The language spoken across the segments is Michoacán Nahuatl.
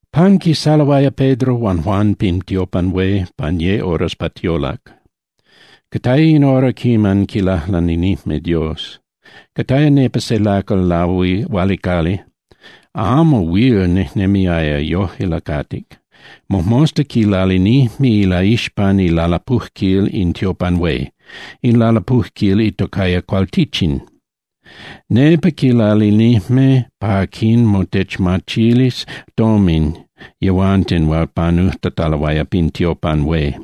Panquisaloaya Pedro huan Juan pin tiopan hué pan ye horas pa tiolac. Cataya in hora quiman quilajlaninijme Dios. Cataya nepa se lacal lahualicali, amo huil nejnemiaya, yojque lacatic. Mojmosta quilalinijme ilaixpan ilalapujquil in tiopan hué, in lalapujquil itocaya Cualtichin. Nepa quilalinijme pa quinmotemachilis tomin yehuanten hual panujtataloaya pin tiopan hué.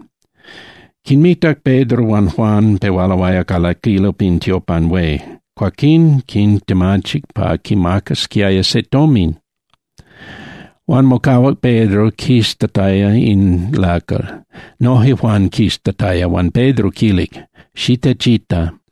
Quinmitac Pedro huan Juan pehualoaya calaquilo pin tiopan hué. Cuaquín quintemachic pa quimacasquiaya se tomin. Huan mocahuac Pedro quiztataya in lacal, noje Juan quiztataya, huan Pedro quilic: —Xitechita.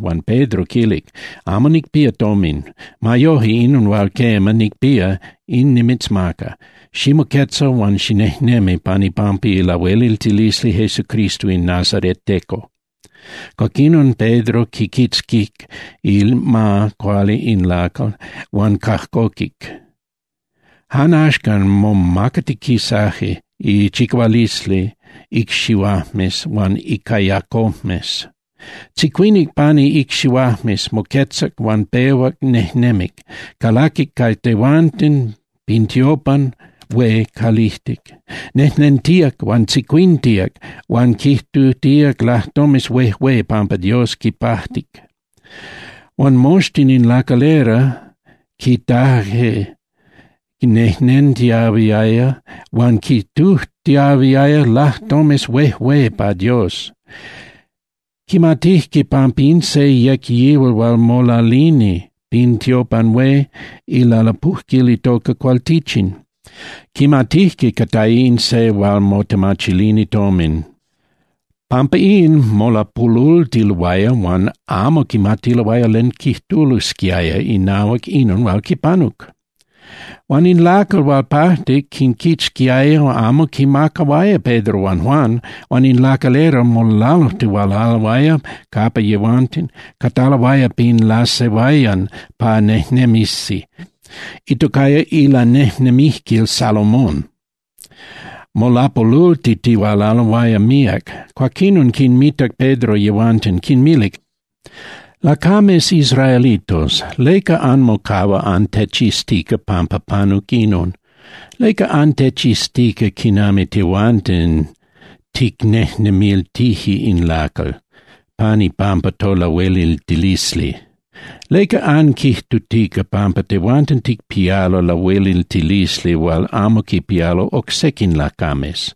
Huan Pedro quilic: —Amo nicpía tomin. Ma yoje, inon hual, quema, nicpía, in nimitzmaca: Ximoquetza huan xinejnemi pan ipampa ilahueliltilisli Jesucristo in nazareteco. Cuaquinon Pedro quiquitzquic ima cuali in lacal huan cajcoquic. Jan axcan momacatiquisaje chicahualisli icxihuajmes huan icayacojmes. Tzicuinic pani icxihuajmes, moquetzac huan pehuac nejnemic, calaquic ca yehuanten pin tiopan hué calijtic, nejnentíac huan tzicuintíac huan quijtutíac lajtomes huejué pampa Dios quipajtic. Huan moxtin in lacalera quitajque nejnentiahuiaya huan quijtutiahuiaya lajtomes huejué pa Dios. Quimatijque pampa in se yec yihual hual molalini pin tiopan hué ilalapujquil itoca Cualtichin. Quimatijque cataya in se hual motemachilini tomin. Pampa in, molapolultiloaya huan amo quimatiloaya len quijtulosquiaya inahuac inon hual quipanuc. Huan in lacal hual pajtic quinquitzquiaya, amo quinmacahuaya Pedro huan Juan, huan in lacalera molalujtihualaloaya capa yehuanten cataloaya pin lasehuayan pa nejnemisi, itocaya Ilanejnemijquil Salomón, molapolultitihualaloaya míac. Cuaquinon quinmitac Pedro yehuanten, quinmilic: —Lacames israelitos, ¿leca anmocahua antechiztica pampa panuc inon? ¿Leca antechiztica quinami tehuanten ticnejnemiltije in lacal pan ipampa tolahueliltilisli? ¿Leca anquijtutica pampa tehuanten ticpialo lahueliltilisli hual amo quipialo oc sequin lacames?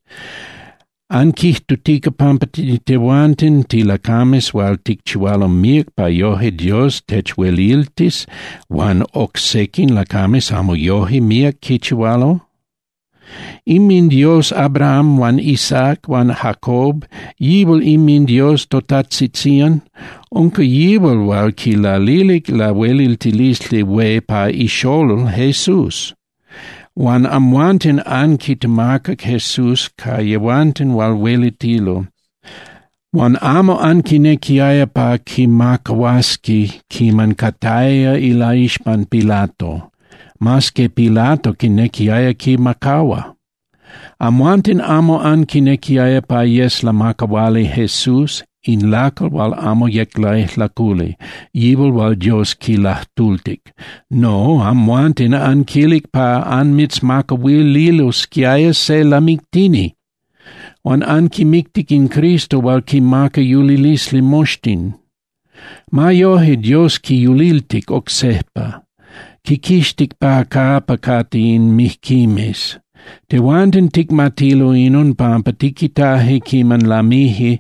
¿Anquijtutica pampa tehuanten tilacames hual ticchihualo míac pa yoje Dios techhueliltis huan oc sequin lacames amo yoje míac quichihualo? InminDios Abraham huan Isaac huan Jacob, yihual inminDios totajtzitzían, unca yihual hual quilalilic lahueliltilisli hué pa iXolol Jesús. Huan amhuanten anquitemacac Jesús ca yehuanten hual huelitilo, huan amo anquinequiaya pa quimacahuasqui quiman cataya ilaixpan Pilato, mas que Pilato quinequiaya quimacahua. Amhuanten amo anquinequiaya pa yes lamacahuali Jesús in lacal hual amo yec laijlaculi, yihual hual Dios quilajtultic. No, amhuanten anquilic pa anmitzmacahuililosquiaya se lamictini. Huan anquimictic in Cristo hual quinmaca yulilisli moxtin. Ma yoje Dios quiyuliltic oc sejpa, quiquixtic pa capa cate in mijquimes. Tehuanten ticmatilo inon pampa tiquitaje quiman lamije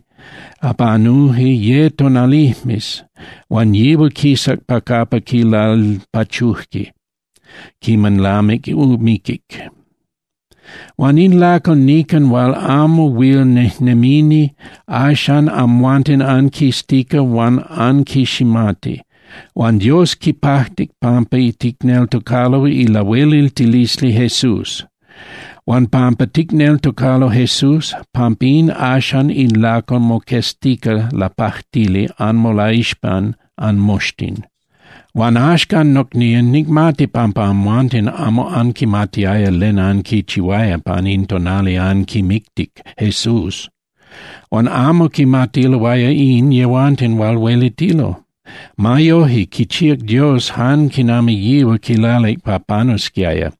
panuje ye tonalijmes huan yihual quisac pa capa quilalpachuje quiman lamic miquic. Huan in lacal nican hual amo huil nejnemini axan amhuanten anquiztica huan anquiximati. Huan Dios quipajtic pampa ticneltocalo ilahueliltilisli Jesús. Huan pampa ticneltocalo Jesús, pampín axan in lacal moqueztica lapajtili anmolaixpan anmoxtin. ’Huan axcan, nocnían, nicmati pampa amhuanten amo anquimatiaya len anquichihuaya pan in tonali anquimictic Jesús, huan amo quimatiloaya in yehuanten hual huelitilo. Ma yoje, quichíac Dios jan quinami yihual quilalic pa panusquiaya,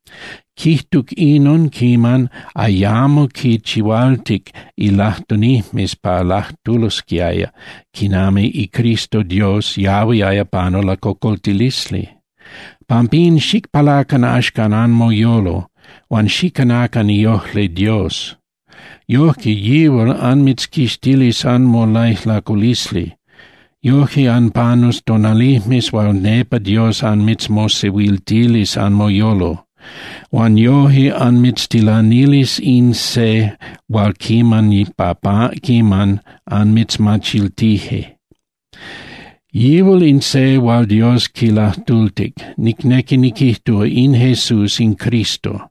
quijtuc inon quiman ayamo quinchihualtic ilajtunijmes pa lajtulosquiaya quinami iCristo Dios yahuiaya panu lacocoltilisli. Pampin xicpalacan axcan anmoyolo, huan xicanacan iojli Dios. Yojque yihual anmitzquixtilis anmolaijlaculisli. Yojque anpanus tonalijmes hual nepa Dios anmitzmosehuiltilis anmoyolo. Huan yoje anmitztilanilis in se hual niman pa quiman anmitzmachiltije. Yihual in se hual Dios quilajtultic, nicnequi niquijtúa, in Jesús in Cristo.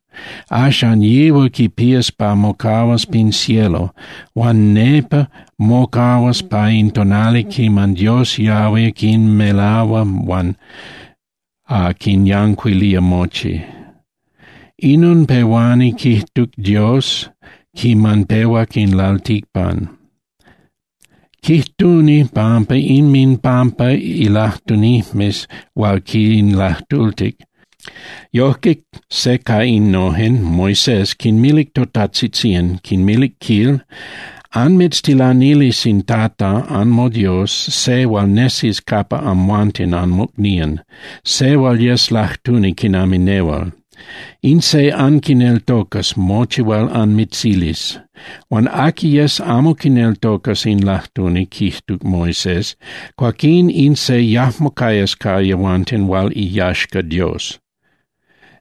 ’Axan yihual quipías pa mocahuas pin cielo, huan nepa mocahuas pa in tonali quiman Dios yahui quinmelahua huan quinyancuilía mochi. Inon pehuani quijtu Dios quiman pehuac in lalticpan. Quijtuni pan inminpampa ilajtunijmes hual quinlajtultic. Yojque se ca innojen, Moisés, quinmilic totajtzitzían, quinmilic, quil: “Anmitztilanilis in Tata anmoDios se hual nesis capa amhuanten anmocnían, se hual yes lajtuni quinami nehual. In se anquineltocas mochi hual anmitzilis. Huan aqui yes amo quineltocas in lajtuni” quijtuc Moisés, “cuaquín in se yajmo cayas ca yehuanten hual iyaxca Dios.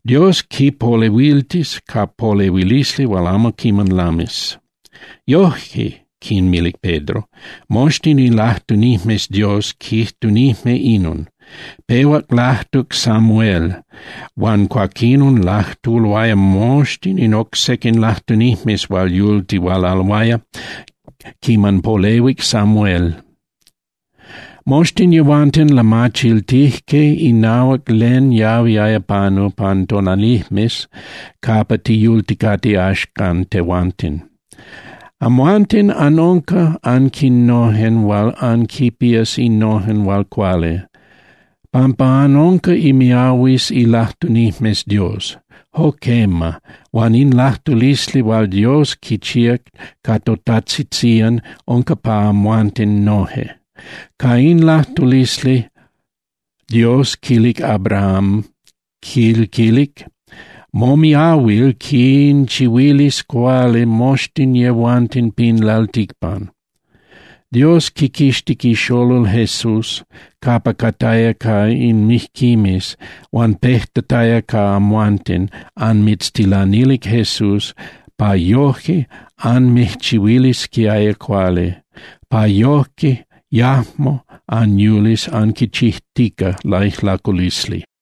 Dios quipolehuiltis ca polehuilisli hual amo quiman lamis.” ’Yoje —quinmilic Pedro—, moxtin ilajtunijmes Dios quijtunijme inon. Pehuac lajtuc Samuel huan cuaquinon lajtuloaya moxtin in oc sequin lajtunijmes hual yultihualaloaya quiman polehuic Samuel. Moxtin yehuanten lamachiltijque inahuac len yahuiaya panu pan tonalijmes capa tiyulticate axcan tehuanten. Amhuanten anunca aquinojen hual anquipías innojen hual cuali, pampa anunca imiahuimes ilajtunijmes Dios. Jo quema, huan in lajtulisli hual Dios quichíac ca totajtzitzían unca pa amhuanten noje. Ca in lajtulisli Dios quilic Abraham, quil quilic: “Momiahuil quinchihuilis cuali moxtin yehuanten pin lalticpan.” Dios quiquixtic iXolol Jesús capa cataya ca in mijquimes, huan pejtataya ca amhuanten, anmitztilanilic Jesús pa yoje anmijchihuilisquiaya cuali, pa yojque yajmo anyulis anquichijtica laijlaculisli.